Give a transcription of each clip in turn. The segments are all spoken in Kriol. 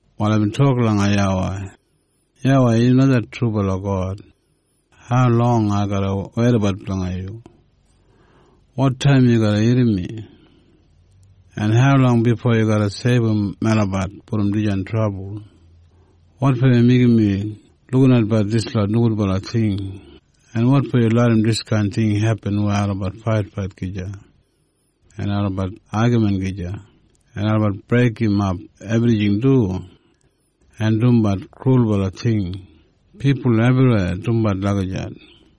Wal aibin tok langa YAWEI, “YAWEI, yu na det trubala God. Haulong ai garra weidabat blanga yu? Wotaim yu garra irrim mi? En haulong bifo yu garra seibum melabat brom dijan trabul? Wotfo yu meigim mi lukinatbat dislot nogudbala ting, en wotfo yu larram diskain ting hepin weya olabat faitfait gija en olabat agamin gija, en olabat breigimap ebrijing du en dumbat krulbala ting? Pipul ebriweya dumbat lagijat.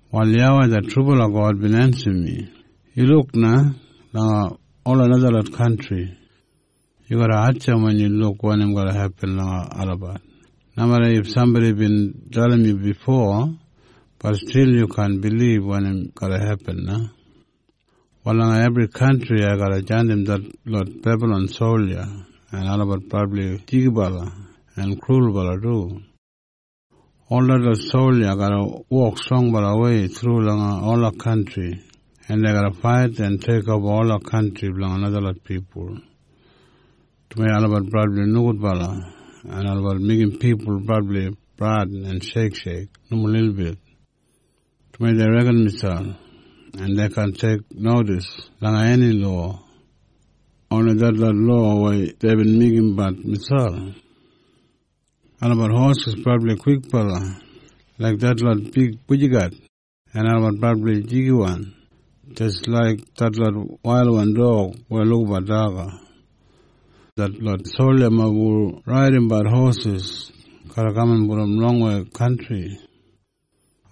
Wal YAWEI det trubala God bin ensim mi, “Yu luk na langa ola najalot kantri! Yu garra hatjamp wen yu luk wanim garra hepin langa olabat. Nomeda if sambodi bin dalim yu bifo, bat stil yu kaan bilib wanim garra hepin na. Wal langa ebri kantri ai garra jandim detlot Bebalon solja en olabat brabli jigibala en krulbala du. Ol detlot solja garra wok strongbalawei thru langa ola kantri en dei garra fait en teikoba ola kantri blanga najalot pipul. Dumaji olabat brabli nogudbala, en olabat meigim pipul brabli bradin en sheiksheik nomo lilbit, dumaji dei reken miselp, en dei kaan teiknodis langa eni lowa, oni detlot lowa weya deibin meigimbat miselp. “Olabat hosis brabli kwikbala, laiga detlot big bujiget, en olabat brabli jigiwan jis laik detlot wailwan dog weya lukabat daga. Detlot soljamob hu raidimbat hosis garra kaman brom longwei kantri.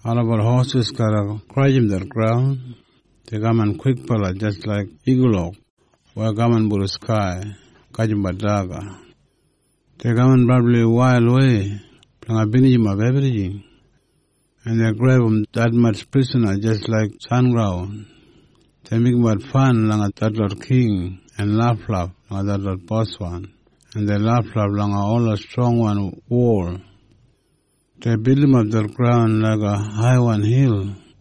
Olabat hosis garra grajim det graun. Dei kaman kwikbala jis laik igulok weya kaman brom skai, gajimbat daga. Dei kaman brabli wailwei blanga binijimap ebrijing. En dei grebum detmatj prisana jis laik sengraun. Dei meigimbat fan langa detlot king en laflaf langa detlot boswan, en dei laflaf langa ola strongwan wol. Dei bildimap det graun laiga haiwan hil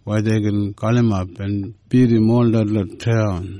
weya dei gin galimap en bidim ol detlot taun.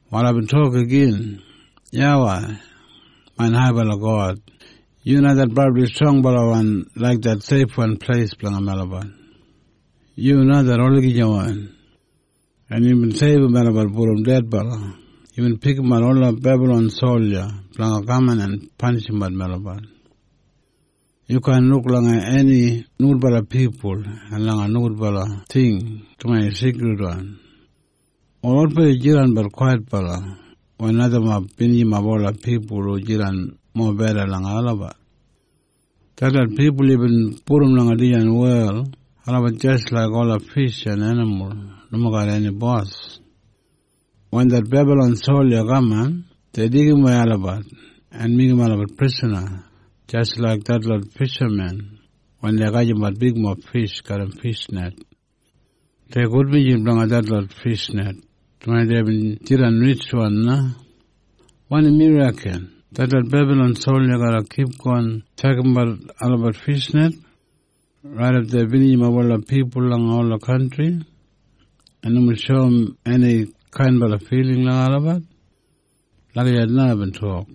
Wal aibin tok igin, “YAWEI, main haibala God, yu na det brabli strongbalawan laik det seifwan pleis blanga melabat. Yu na det olagijawan, en yubin seibum melabat brom dedbala. Yubin pikimat ola Bebalon solja blanga kaman en panishimbat melabat. Yu kaan luk langa eni nogudbala pipul en langa nogudbala ting dumaji yu seikridwan. Wal wotfo yu jidanbat kwaitbala wen najamob binijimap ola pipul hu jidan mobeda langa olabat? “Detlot pipul yubin pudum langa dijan wel, olabat jis laik ola fish en enimul, nomo garram eni bos. Wen det Bebalon solja kaman, dei deigimwei olabat en meigim olabat prisana, jis laik detlot fishamen wen dei gajimbat bigmob fish garram fishnet. Dei gudbinji blanga detlot fishnet, dumaji deibin jidan ritjwan na. “Wanim yu reken? Detlot Bebalon solja garra kipgon tjakambat olabat fishnet raidap dei binijimap ola pipul langa ola kantri en nomo shoum eni kainbala filing langa olabat?” Lagijat na aibin tok.